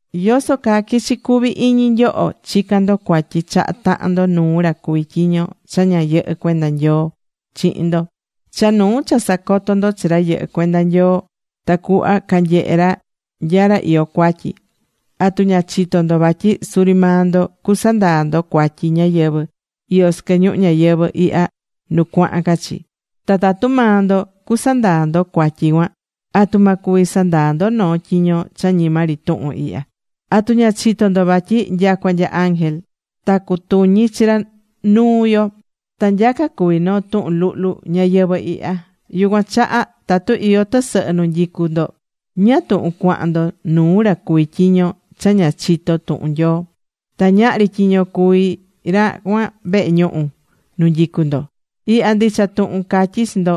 ¿Yoso caa quichi cuvi iñi nyoho chicán ndo cuatyi chaha tahan ndo nuu ra cuví tyiño cha ña yɨhɨ́ cuenda Nyoo chihin ndo, cha nuu cha sacotó ndo chi ra yɨhɨ́ cuenda Nyoo, tacuhva canyehé ra nya ra iyó cuatyi? ¿Atu ña chitó ndo vatyi suri maa ndo cusandaa ndo cuatyi ñáyɨvɨ iyó sɨquɨ ñuhu ñayɨvɨ̱ ihya nu cuahan ca chi? Ta tatu maa ndo cusandaa ndo cuatyi cuan, ¿atu ma cuvi sandaa ndo noo tyiño cha ñima ri tuhun ihya? ¿Atu ña chitó ndo vatyi nyacua nya ángel ta cutuñi chi ra nuu yo? ¡Ta nyaca cuví noo tuhun luhlu ñayɨvɨ̱ ihya! Yucuan chaha tatu iyó tɨsɨhɨ nu nyicú ndo, ¿ñáá tuhun cuahan ndo nuu ra cuví tyiño cha ña chitó tuhun Nyoo?, ta ñahri tyiño cuví ra cuan vehe ñuhu nu nyicú ndo. Ihya ndicha tuhun catyí chi ndo,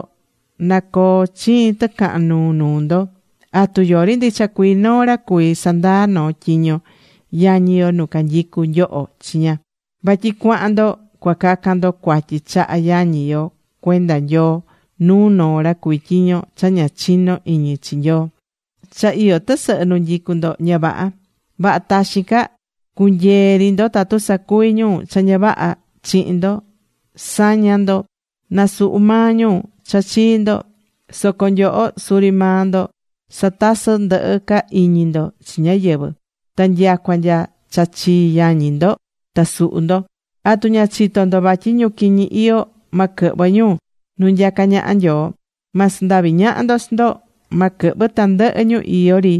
na coo chiin tɨcahan nuu nuu ndo. ¿Atu yori ndicha cuii noo ra cuví sandaa noo tyiño yañi yo nu canyicú nyoho chiña? Vatyi cuahan ndo cua cacan ndo cuatyi chaha yañi yo cuenda Nyoo nuu noo ra cuví tyiño cha ña chiño iñi chi Nyoo. Cha iyó tɨsɨhɨ nu nyicú ndo, ña vaha. Vaha taxin ca cu̱nyee ri ndo tatu sacuvi ñu cha ña vaha chihin ndo. Sa̱ña ndo, na suhu maa ñu cha chii ndo. ¡Soco nyoho suri maa ndo satasɨ́ ndɨhɨ ca iñi ndo chi ñáyɨvɨ, ta nyacua nya cha chii yañi ndo ta suhú ndo! ¿Atu ña chitó ndo vatyi ñu quiñi iyó ma quɨhvɨ ñu nu nyacá ñaha Nyoo? Ma sandavi ñaha ndo chi ndo. Ma quɨhvɨ tandɨhɨ ñu iyó ri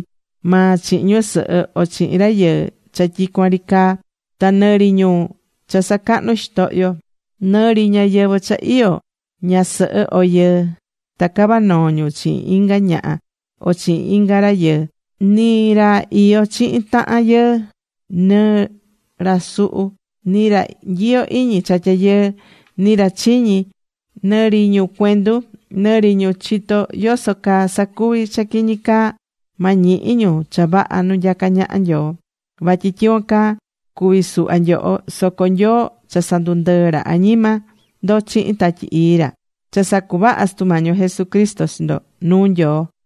maa chihin ñusɨhɨ o chihin rayɨɨ cha tyicuan ri caa. Ta nɨ ri ñu cha sacahnú xitohyo, nɨ ri ñáyɨvɨ cha iyó ñasɨhɨ o yɨɨ, ta cavá noo ñu chihin inga ñaha o chihin inga rayɨɨ, ni ra iyó chihin tahan yɨɨ, nɨ ra suhú, ni ra nyiyó iñi cha tyayɨɨ, ni ra chiñí, nɨ ri ñu cuendu, nɨ ri ñu chitó yoso caa sacuví cha quiñi caa, ma ñihi ñu cha vaha nu nyacá ñaha Nyoo. Vatyi tyicuan caa cuvi̱ suhva nyoho. Soco Nyoo cha sandundɨɨ̱ ra añima ndo chihin Tatyi Ii ra. Cha sacuvaha̱ Sutu Mañi yo Jesucristo chi ndo nuu Nyoo.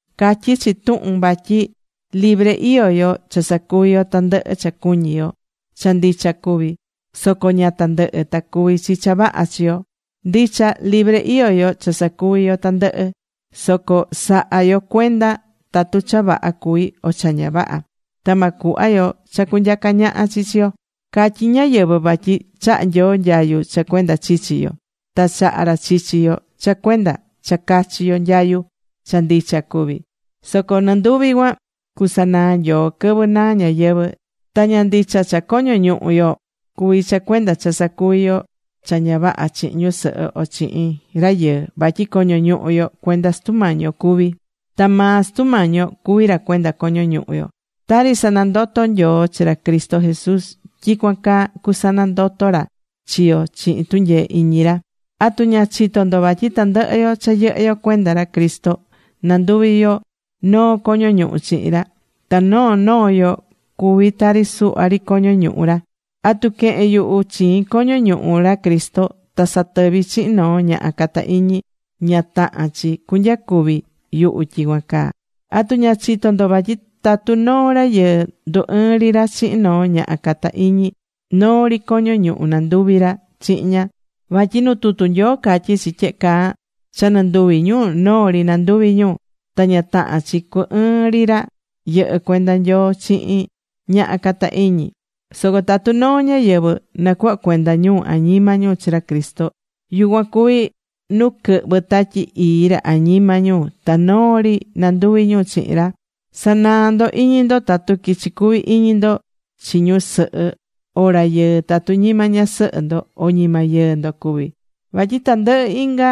Catyí chi tuhun vatyi libre iyó yo cha sacuví yo tandɨhɨ cha cuñí yo. Cha ndicha cuví. Soco ña tandɨhɨ ta cuví chi cha vaha chi yo. Ndicha libre iyó yo cha sacuví yo tandɨhɨ, soco sa̱ha yo cuenda tatu cha vaha cuví o cha ña vaha. Ta ma cuhva yo cha cunyaca ñaha chi chi yo. Catyí ñáyɨvɨ vatyi chahá Nyoo nyayu cha cuenda chichi yo. Ta chaha̱ ra chichi yo cha cuenda cha cachi yo nyayu. Cha ndicha cuví. Soco nɨnduvi cuan cusanaa Nyoo quɨvɨ naa ñayɨvɨ̱. Ta ña ndicha cha coño ñuhu yo cuví cha cuenda cha sacuvi yo cha ña vaha chihin ñusɨhɨ o chihin rayɨɨ. Vatyi coño ñuhu yo cuenda Sutu Mañi yo cuví. Ta maa Sutu Mañi yo cuví ra cuenda coño ñuhu yo. Tari sanandoto̱ Nyoo chi ra Cristo Jesús, tyicuan caa cusanandoto ra chi yo chihin tunyee iñi ra. ¿Atu ña chitó ndo vatyi tandɨhɨ yo cha yɨhɨ́ yo cuenda ra Cristo nanduvi yo noo coño ñuhu chihin ra? Ta noo noo yo cuví tari suhva ri coño ñuhu ra. ¿Atu quehen yuhu chiin coño ñuhu ra Cristo ta satɨví chihin noo ñaha cata iñi? Ña tahán chi cunyacuvi yuhu tyicuan caa. ¿Atu ña chitó ndo vatyi tatu noo rayɨɨ ndu ɨɨn ri ra chihin noo ñaha cata iñi, noo ri coño ñuhu nanduví ra chihin ña? Vatyi nu tutu Nyoo catyí chi tyehe caa: “Cha nɨnduvi ñu, noo ri nanduvi ñu.” Ta ña tahán chi cu ɨɨn ri ra yɨhɨ́ cuenda Nyoo chihin ñaha cata iñi. Soco tatu noo ñáyɨvɨ nacuhvá cuenda ñu añima ñu chi ra Cristo, yucuan cuví nu quɨhvɨ́ Tatyi Ii ra añima ñu ta noo ri nanduví ñu chihin ra. Sa̱naa ndo iñi ndo tatu quichi cuvi iñi ndo chi ñusɨhɨ o rayɨɨ tatu ñima ñasɨhɨ ndo o ñima yɨɨ ndo cuví. Vatyi tandɨhɨ inga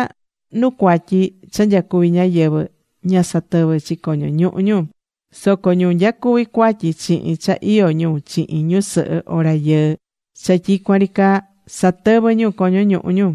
nu cuatyi cha nyacuví ñáyɨvɨ ña satɨvɨ́ chi coño ñuhu ñu. Soco ñu nyacuví cuatyi chihin cha iyó ñu chihin ñusɨhɨ o rayɨɨ cha tyicuan ri caa, satɨvɨ́ ñu coño ñuhu ñu.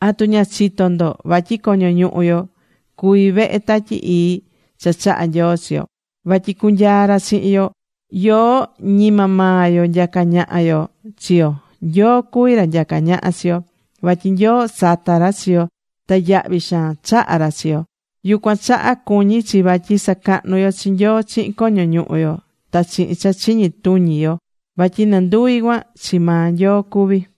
¿Atu ña chitó ndo vatyi coño ñuhu yo cuví vehe Tatyi Ii cha chaha̱ Nyoo chi yo, vatyi cunyaa ra chihin yo? Yoó ñima maa yo nyacá ñaha yo chi yo, Nyoo cuví ra nyacá ñaha chi yo. Vatyi Nyoo sata̱ ra chi yo ta yahvi xaan chaha̱ ra chi yo. Yucuan chaha cuñí chi vatyi sacahnú yo chi Nyoo chihin coño ñuhu yo, ta chihin cha chiñi tuñi yo vatyi nɨnduvi cuan, chi maa Nyoo cuví.